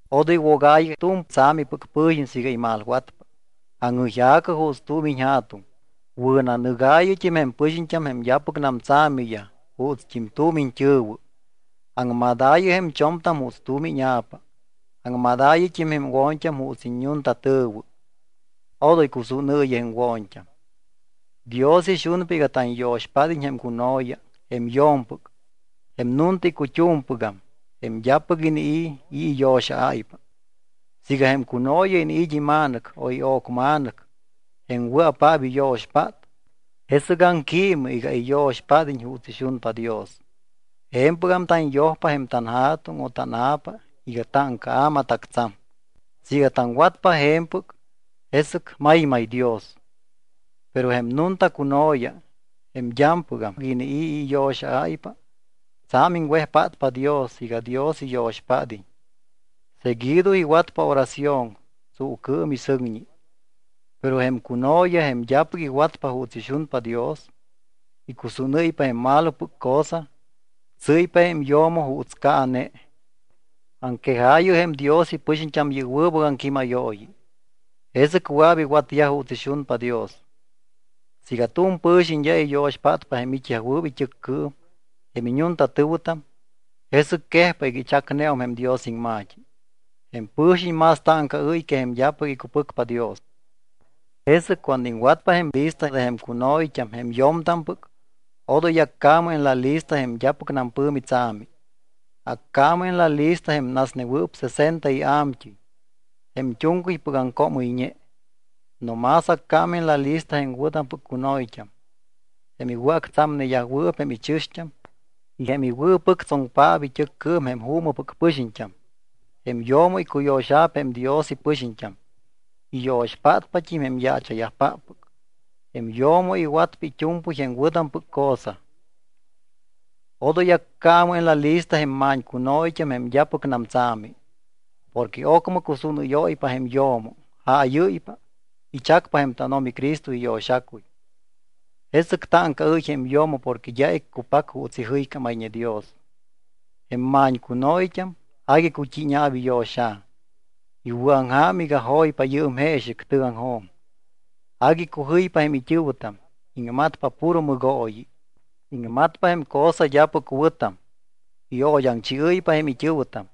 Odoy wogaayɨ tu̱m tsa̱mipɨc pɨ̱xiñ siiga imalwatpa. Aŋjɨyja̱cɨ juuts tu̱m iñja̱tuŋ. Wɨ̱nanɨgaayɨt́im jém pɨxiñt́am jém d́apɨcnam tsa̱miyaj juutst́im tu̱m iñt́ɨ̱wɨ. Aŋmadaayɨ jém cho̱mtam juuts tu̱m íña̱pa. Aŋmadaayɨt́im jém wo̱ñt́am juuts iñu̱ntatɨ̱wɨ. Odoy cusúnɨɨyɨ jém wo̱ñt́am. Dios ixunpa iga tanyo̱xpád́iñ jém cuno̱ya, jém yo̱mpɨc, jém nunta icut́umpɨgam, jém d́apɨc inii̱ i̱ iyo̱xa̱áypa. Siiga jém cuno̱ya iniit́ ima̱nɨc o io̱cma̱nɨc jém wɨa̱paap iyo̱xpát, jesɨc aŋquiimɨ iga iyo̱xpád́iñ juuts ixunpa Dios. Je̱mpɨgam tanyojpa jém tanja̱tuŋ o tána̱pa iga táŋcaa̱ matactsa̱m. Siiga taŋwatpa je̱mpɨc, jesɨc maymay Dios. Pero jém nunta cuno̱ya, jém d́ampɨgam inii̱ i̱ iyo̱xa̱áypa, tsa̱m iŋwejpátpa Dios iga Dios iyo̱xpád́iñ. Seguido iwatpa oración tsuucɨɨm y sɨŋñi. Pero jém cuno̱ya, jém d́apɨc iwatpa juuts ixunpa Dios, icusúnɨ́ypa jém malopɨc cosa. Tsɨ́ypa jém yo̱mo juuts caane. Aŋquejaayɨ jém Dios ipɨxiñt́am yɨ́p wɨbɨc aŋquímayooyi. Jesɨc wɨa̱p iwatyaj juuts ixunpa Dios. Siiga tu̱m pɨ̱xiñ d́a iyo̱xpátpa jém it́yajwɨɨp it́ɨccɨɨm, jém iñuntatɨ̱wɨtam, jesɨc quejpa iga ichacneum jém Dios iŋma̱t́i. Jém pɨ̱xiñ más táŋcaɨ́y que jém d́apɨc icupɨcpa Dios. Jesɨc cuando iŋwatpa jém lista de jém cuno̱yt́am, jém yo̱mtampɨc, odoy accaamɨ en la lista jém d́apɨcnam pɨ̱mi tsa̱mi. Accaamɨ en la lista jém nasnewɨɨp sesenta ia̱mt́ɨy, jém tu̱ŋcɨypɨc aŋcoomɨyñe. No más accaamɨ en la lista jém wɨ̱tampɨc cuno̱yt́am, jém iwɨ̱actsa̱mneyajwɨɨp jém ichɨ̱xt́am y jém iwɨ̱pɨctsoŋpaap it́ɨccɨɨm jém juumɨpɨc pɨxiñt́am. Jém yo̱mo icuyo̱xa̱p jém Dios ipɨxiñt́am, iyo̱xpátpat́im jém yaacha̱yajpáppɨc. Jém yo̱mo iwatpa it́u̱mpɨy jém wɨ̱tampɨc cosa. Odoy accaamɨ en la lista jém ma̱ñcuno̱yt́am jém d́apɨcnam tsa̱mi. Porque ocmɨ cusúnɨ́yóypa jém yo̱mo, jáyɨ́ypa. Ichacpa jém tánO̱mi Cristo iyo̱xacuy. Jesɨc táŋcaɨ́y jém yo̱mo porque d́a iccupac juuts ijɨycámayñe Dios. Jém ma̱ñcuno̱yt́am agui cut́íña̱p iyo̱xa̱. Iwɨ̱aŋja̱m iga joypa yɨɨm jeexɨc tɨgaŋjo̱m. Agui icujɨypa jém it́ɨ̱wɨtam, iŋmatpa puro mɨgooyi. Iŋmatpa jém cosa d́apɨc wɨ̱tam. Io̱d́aŋchiɨ́ypa jém it́ɨ̱wɨtam.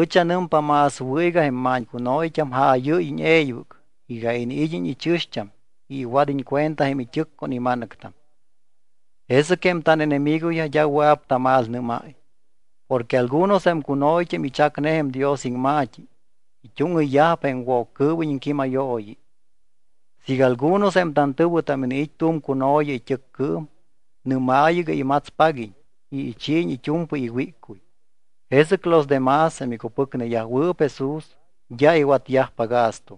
Ɨch anɨmpa más wɨ̱ iga jém ma̱ñcuno̱yt́am jaayɨ́yiñ e̱ybɨc iga iniid́iñ ichɨ̱xt́am y iwad́iñ cuenta jém it́ɨc con ima̱nɨctam. Jesɨc jém tánenemigoyaj d́a wɨa̱p tamalnɨ́máy. Porque algunos jém cuno̱yt́am ichacne jém Dios iŋma̱t́i, it́úŋɨyyajpa jém Woccɨɨwiñ iŋquímayooyi. Siiga algunos jém tantɨ̱wɨtam iniit́ tu̱m cuno̱ya it́ɨccɨɨm, nɨ́maayɨ iga imatspaguiñ y ichiiñ it́u̱mpɨy iwíccuy. Jesɨc los de más, jém icupɨcneyajwɨɨp Jesús, d́a iwatyajpa gasto.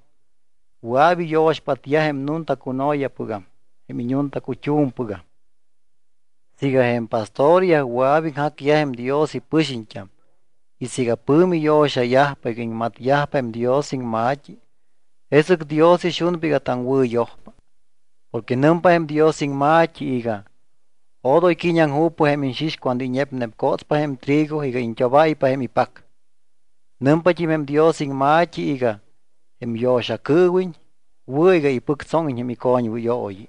Wɨa̱p iyo̱xpátyaj jém nunta cuno̱yapɨgam jém iñuntacut́u̱mpɨgam. Siiga jém pastoryaj wɨa̱p iŋjacyaj jém Dios ipɨxiñt́am y siiga pɨ̱mi yo̱xayajpa iga iŋmatyajpa jém Dios iŋma̱t́i, jesɨc Dios ixunpa iga taŋwɨ̱yojpa. Porque nɨmpa jém Dios iŋma̱t́i iga: “Odoy qui̱ñiaŋju̱pɨ jém iñxix cuando iñepnepcotspa jém trigo iga iñt́obáypa jém ipac.” Nɨmpat́im jém Dios iŋma̱t́i iga: “Jém yo̱xacɨɨwiñ wɨ̱ iga ipɨctsóŋiñ jém icoñwɨyooyi.”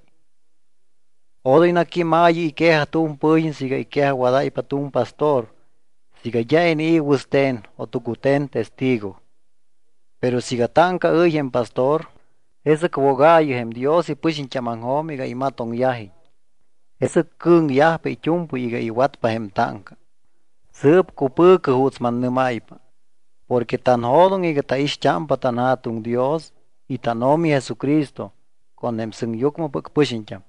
Odoy naquímaayɨ iquejaj tu̱m pɨ̱xiñ siiga iquejajwadáypa tu̱m pastor siiga d́a inii̱ wɨste̱n o tucute̱n testigo. Pero siiga táŋcaɨ́y jém pastor, jesɨc wogaayɨ jém Dios ipɨxiñt́ámaŋjo̱m iga imatoŋyajiñ. Jesɨc cɨ̱ŋyajpa it́u̱mpɨy iga iwatpa jém táŋca. Sɨɨp cupɨ̱cɨ juuts mannɨ́máypa porque tanjo̱doŋ iga taixt́ámpa tanJa̱tuŋ Dios y tánO̱mi Jesucristo con jém sɨŋyucmɨpɨc pɨxiñt́am.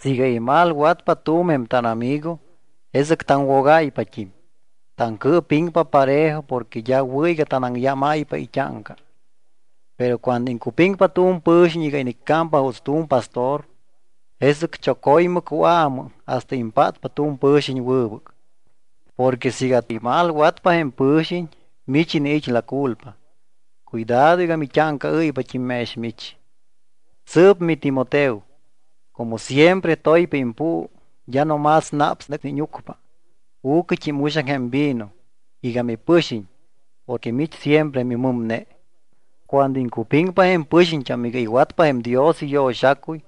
Siiga imalwatpa tu̱m jém tánamigo, jesɨc taŋwogáypat́im. Taŋcɨɨpiŋpa parejo porque d́a wɨ̱ iga tanaŋyámáypa it́áŋca. Pero cuando iŋcupiŋpa tu̱m pɨ̱xiñ iga iniccámpa juuts tu̱m pastor, jesɨc choco̱ymɨ cuaamɨ hasta impátpa tu̱m pɨ̱xiñ wɨbɨc. Porque siiga imalwatpa jém pɨ̱xiñ, mich iniit́ la culpa. Cuidado iga mit́áŋcaɨ́ypat́im mex mich. Sɨɨp miTimoteo, como siempre toypa impuu, d́a no más naps nɨ íñucpa, u̱cɨt́im uxaŋ jém vino iga mipɨxiñ porque mich siempre mimɨmne. Cuando iŋcupiŋpa jém pɨxiñt́am iga iwatpa jém Dios iyo̱xacuy,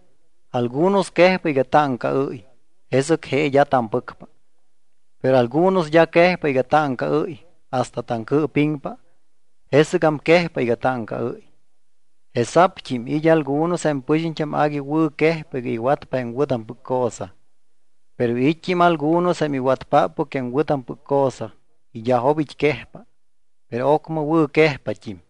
algunos quejpa iga táŋcaɨ́y, jesɨc je d́a tampɨcpa. Pero algunos d́a quejpa iga táŋcaɨ́y hasta taŋcɨɨpiŋpa, jesɨgam quejpa iga táŋcaɨ́y. Jesa̱pt́im it́ algunos jém pɨxiñt́am agui wɨ̱quejpa iga iwatpa jém wɨ̱tampɨc cosa. Pero it́t́im algunos jém iwatpáppɨc jém wɨ̱tampɨc cosa y d́a jo̱bit́ quejpa. Pero ocmɨ wɨ̱quejpat́im.